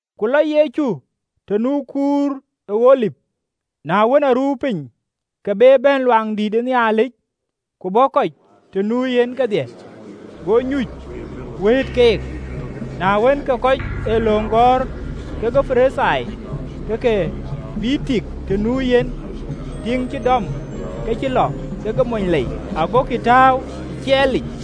Ku lɔ Yecu të nu kuur ë Olip. Na wën, aruu piny, ke be bɛ̈n ë Luaŋdïtic, ku bɔ̈ kɔc të nu yen kedhie, go nyuc, wëët keek. Na wën, ke kɔc ee löŋ gɔ̈ɔ̈r kekë Parithai ke ke bïï tik të nu yen, tiiŋ cï dɔm ke cï lɔ kekë mony lei, agokï tääu ë ciɛɛlic.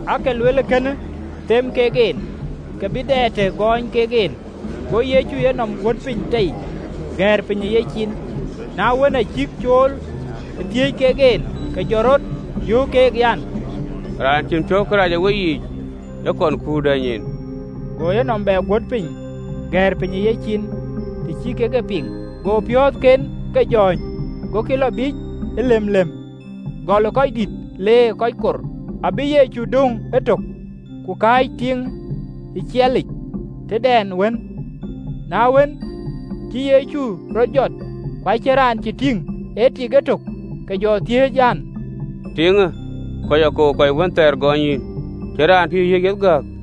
Aake luel kënë them kek en, ke bï dɛ të gɔɔny kek en. Go Yecu enɔm guöt piny tei, gɛ̈ɛ̈r piny e yecin. Na wën, acïk cool e thiëëc kek en, ke jɔ rɔt jɔt, yöök keek an, “Raan cïn piɔ̈u kërac ë weyiic, ë kɔn kuur dɛ̈ny en.” Go yenɔm bɛ guöt piny, gɛ̈ɛ̈r piny ë yecin. Të cï kek e piŋ, go piɔ̈ɔ̈thken ke jɔ̈ɔ̈ny, gokï lɔ biic ëlemlem, gɔl ë röördït, leer ë kɔc kor: abï Yecu döŋ etök, ku kaac tiiŋë ë ciɛɛlic tëdɛn wën. Na wën, acï Yecu rɔt jɔt, ku acïn raan cï tïŋ, ee tik etök, ke jɔ thiëëc an, “Tiiŋë, kɔc akou kɔc wënthɛɛr gɔɔny yïn? Cïn raan cï yïn yiëk yeth gääk?”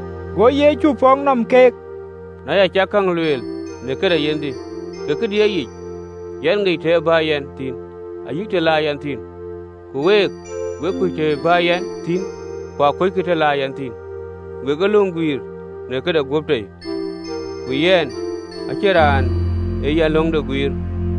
Go Yecu pɔ̈k nɔm keek an, “Na ya cak käŋ lueel në këde yenhde, ke këdï ee yic, yɛn ŋic të ë bä yɛn thïn ayï të la yɛn thïn, ku week, we kuc të ë bä yɛn thïn, ku kuöckï të la yɛn thïn. Wek ee löŋ guiir në këde guöp tei, ku yɛn, acïn raan aa yɛn löŋde guiir.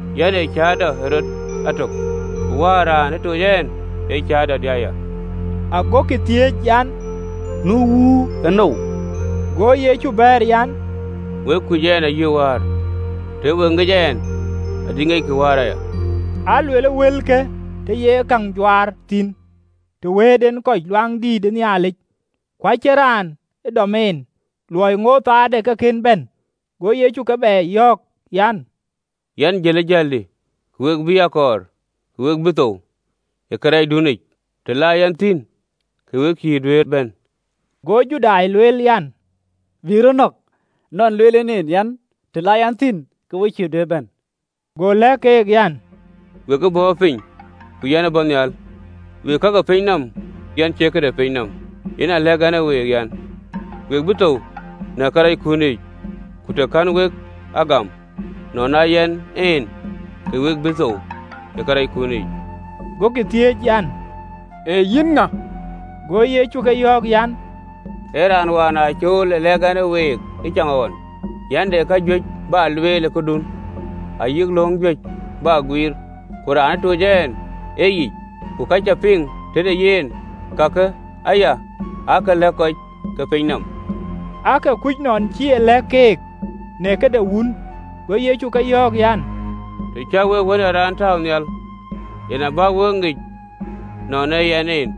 Yɛn ee cäätɔ ë rɔt atök, ku Wäär raan ë toc ɛn ee cäätɔdï aya.” Agokï thiëëc an, “Nu Wuur ënou?” Go Yecu bɛ̈ɛ̈r an, “Kuc ɛn ayï Wäär: tëë we ŋic ɛn, adï ŋiɛckï Wäär aya.” Aa luel wëlke të ye käŋ juaar thïn, të wëët en kɔc ë Luaŋdïtic: ku acïn raan cï yen dɔm, në luɔi ŋootë ë köölde ke kën bɛ̈n. Go Yecu keek bɛ yɔ̈ɔ̈k an, “Yɛn jël ë jäldï, ku we bï a kɔɔr, ku we bï thou ë kërɛɛcdunic: të la yɛn thïn, ke wek cïï duëër bɛ̈n.” Go Judai lueel an, “Bï rɔt nɔ̈k, nɔn lueel en en an, të la yɛn thïn, ke wek cï duëër bɛ̈n?” Go lɛ̈k keek an, “Wek ë bɔ̈ piny, ku yɛn ë bɔ̈ nhial: wek ee ka ke pinyë nɔm, yɛn cie kë de pinyë nɔm. Yen aa lɛ̈k ɛn e week, an, we bï thou në karɛckun yiic: ku të kɛ̈n wek a gam, ‘nɔn aa Yɛn En,’ ke we bï thou ë karɛckun yiic.” Gokï thiëëc an, “Ee yïn ŋa?” Go Yecu ke yɔ̈ɔ̈k an, “Ee raan wään aa cool ë lɛ̈k ɛn e week ëcaŋɣɔn. Yɛn de kajuëc bä lueel ë këdun ayï lööŋ juëc bä guiir: ku raan ë toc ɛn ee yic, ku ka cä piŋ tëde yen, kakë aya ke lɛ̈k kɔc ke piny nɔm.” Aake kuc nɔn cï e lɛ̈k keek në këde Wun. Go Yecu ke yɔ̈ɔ̈k an, “Të cä wek Wën ë Raan tääu nhial, yen abä wek e ŋic nɔn aa Yɛn En,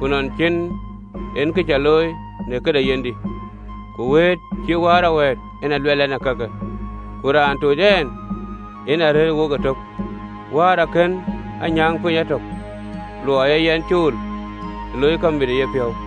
ku nɔn cïn en kë cä looi në këde yenhdï, ku wëët cïï Wäär a wɛ̈ɛ̈t, yen aa luɛɛl ɛn kakë. Ku raan ë toc ɛn, yen arëër wok ëtök, Wäär akën a nyääŋ piny atök, luɔi aa yɛn cool ë loi kamit në yepiɔ̈u.”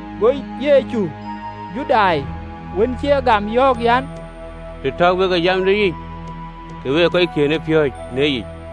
Go Yecu Judai wën cï ye gam yɔ̈ɔ̈k an, “Të täu wek ë jamdï yic, ka wek ee kɔckiën ë piööcë në yic,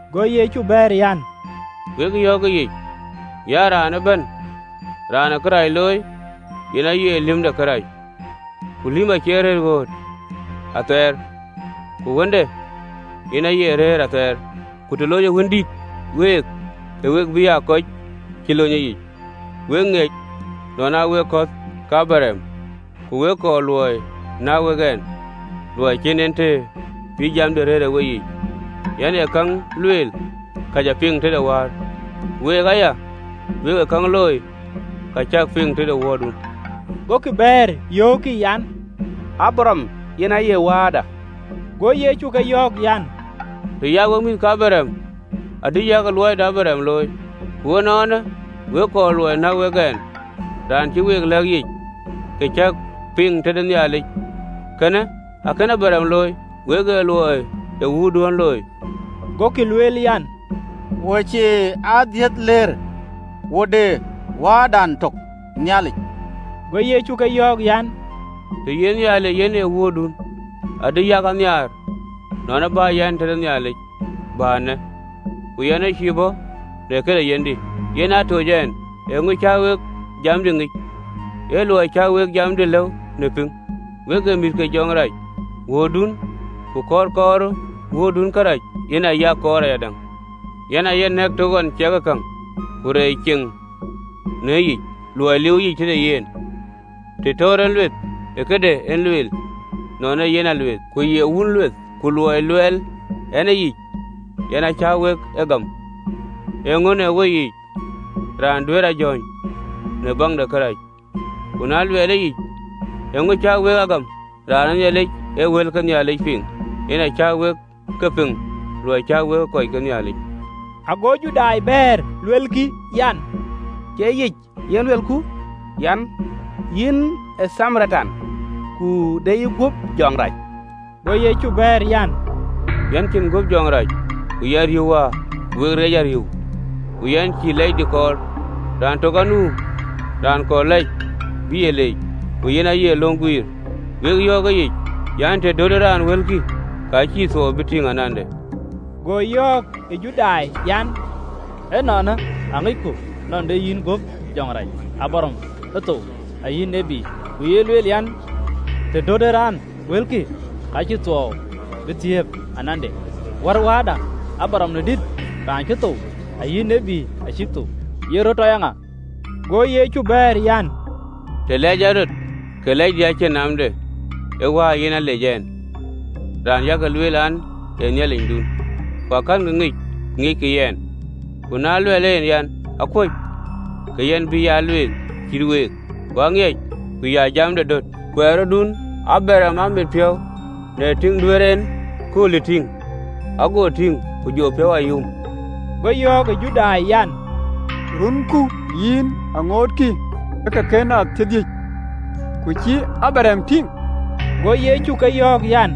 Go Yecu bɛ̈ɛ̈r an, “Wek yɔ̈ɔ̈k ëyic an, ‘Raan ëbɛ̈n raan ë kërac looi, yen aye lïm ë kërac. Ku lïm acie rëër ɣööt athɛɛr: ku Wëndït yen aye rëër athɛɛr. Ku të lonyë Wëndït week, ke we bï aa kɔc cï lony. Wek ŋiɛc nɔn aa wek kɔ̈th ke Abraɣam, ku wek kɔɔr luɔi näk wek ɛn, luɔi cïn en të bï jamdï rëër ë weyiic. Yɛn ee käŋ lueel ka cä piŋ tëde Wäär: ku week aya, wek ee käŋ looi ka cäk piŋ tëde wuöördun.” Gokï bɛ̈ɛ̈r, yöökkï an, “Abraɣam yen aye wääda.” Go Yecu ke yɔ̈ɔ̈k an, “Të ya wek mïth ke Abraɣam adï yak luɔi de Abraɣam looi. Ku ënɔɔnë, wek kɔɔr luɔi näk wek ɛn, raan cï week lɛ̈k yic, kë cä piŋ tëde Nhialic: kënë akënë Abraɣam looi! Wek ee luɔi ë wuöördun looi.” Gokï lueel an, “Wo cie adhiëthlëër, wo de Wääda tök, Nhialic.” Go Yecu ke yɔ̈ɔ̈k an, “Tëë ye Nhialic yen ee Wuöördun, adï yak a nhiaar: nɔn ë bä yɛn tëde Nhialic bä eenë, ku yɛn ë cïï bɔ̈ në këde yenhdï, yen aa toc ɛn. Eeŋö cä wek jamdï ŋic? Ee luɔi cä wek jamdï lëu në pïŋ. Wek ee mïth ke jɔŋdït rac wuöördun, ku kɔ̈ɔ̈r kɔɔrë wuöördun kërac, yen aa yak kɔɔr ayadäŋ. Yen aaye nɛ̈k të ɣɔn ciɛkë käŋ, ku reec ceŋ në yicic, luɔi liiuwë yic tëde yen. Të töör en lueth, ee këde en lueel, nɔn ee yen alueeth, ku ye wun lueth. Ku luɔi luɛɛl ɛn yic, yen a cä wek a gam. Eeŋa në weyiic raan duëër a jɔ̈ɔ̈ny në baŋ de kërac? Ku na luɛɛl yic, eeŋö cä wek a gam? Raan ë Nhialic ee wël ke Nhialic piŋ: yen acä wek ke piŋ, luɔi cä wek ee kɔc ke Nhialic.” Ago Judai bɛ̈ɛ̈r, luelkï an, “Cie yic en luelku an, Yïn ee Thamaritan, ku de ye guöp jɔŋ rac?” Go Yecu bɛ̈ɛ̈r an, “Yɛn cïn guöp jɔŋ rac, ku yɛn riëëu Wäär, ku wek reec a riëëu. Ku yɛn cïï lɛcdï kɔɔr: raan tök anu raan kɔɔr lɛc bï a leec, ku yen aye löŋ guiir. Wek yɔ̈ɔ̈k ë yic an, të dötë raan wëlkï, ka cïï thuɔɔu bï tïŋ anande.” Go yɔ̈ɔ̈k ë Judai an, “Ënɔɔnë aŋicku nɔn de yïn guöp jɔŋ rac. Abraɣam ë thou, ayï tït, ku ye lueel an, të dötë raan wëlkï, ka cïï thuɔɔu bï thiëëp anande. Wär wääda Abraɣam në dït, raan cï thou? Ayï tït acïk thou: ye rɔt tɔ ye ŋa?” Go Yecu bɛ̈ɛ̈r an, “Të lɛɛc ɛn rɔt, ke lɛcdï acïn naamde: ee Wäär yen alec ɛn, raan yak lueel an, ee Nhialicdun, ku akɛ̈nkï ŋic: ku aŋiɛc yɛn, ku na luɛɛl en an, akuöc ke yɛn bï ya alueeth cït week: ku aŋiɛc, ku ya jamde döt. Kuɛɛrëdun Abraɣam aa mit piɔ̈u në tïŋ duëër en kööldï tïŋ, ago tïŋ, ku jɔ piɔ̈u a yum.” Go yɔ̈ɔ̈k ë Judai an, “Runku yïn aŋootkï ë ke kën aa thiërdhïc, ku cï Abraɣam tïŋ?” Go Yecu ke yɔ̈ɔ̈k an,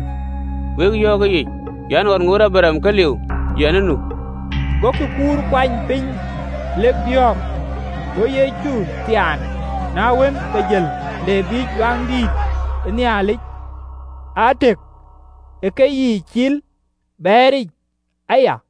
“Wek yɔ̈ɔ̈k ëyic an, ɣɔn ŋootë Abraɣam ke liu, ‘Yɛn ë nu.”’ Gokï kur kuany piny lek biɔ̈ɔ̈k: go Yecu thiaan, na wën, ke jël ë Luaŋdïtic le biic, aa tëk ë keyiic cil, bɛɛric aya.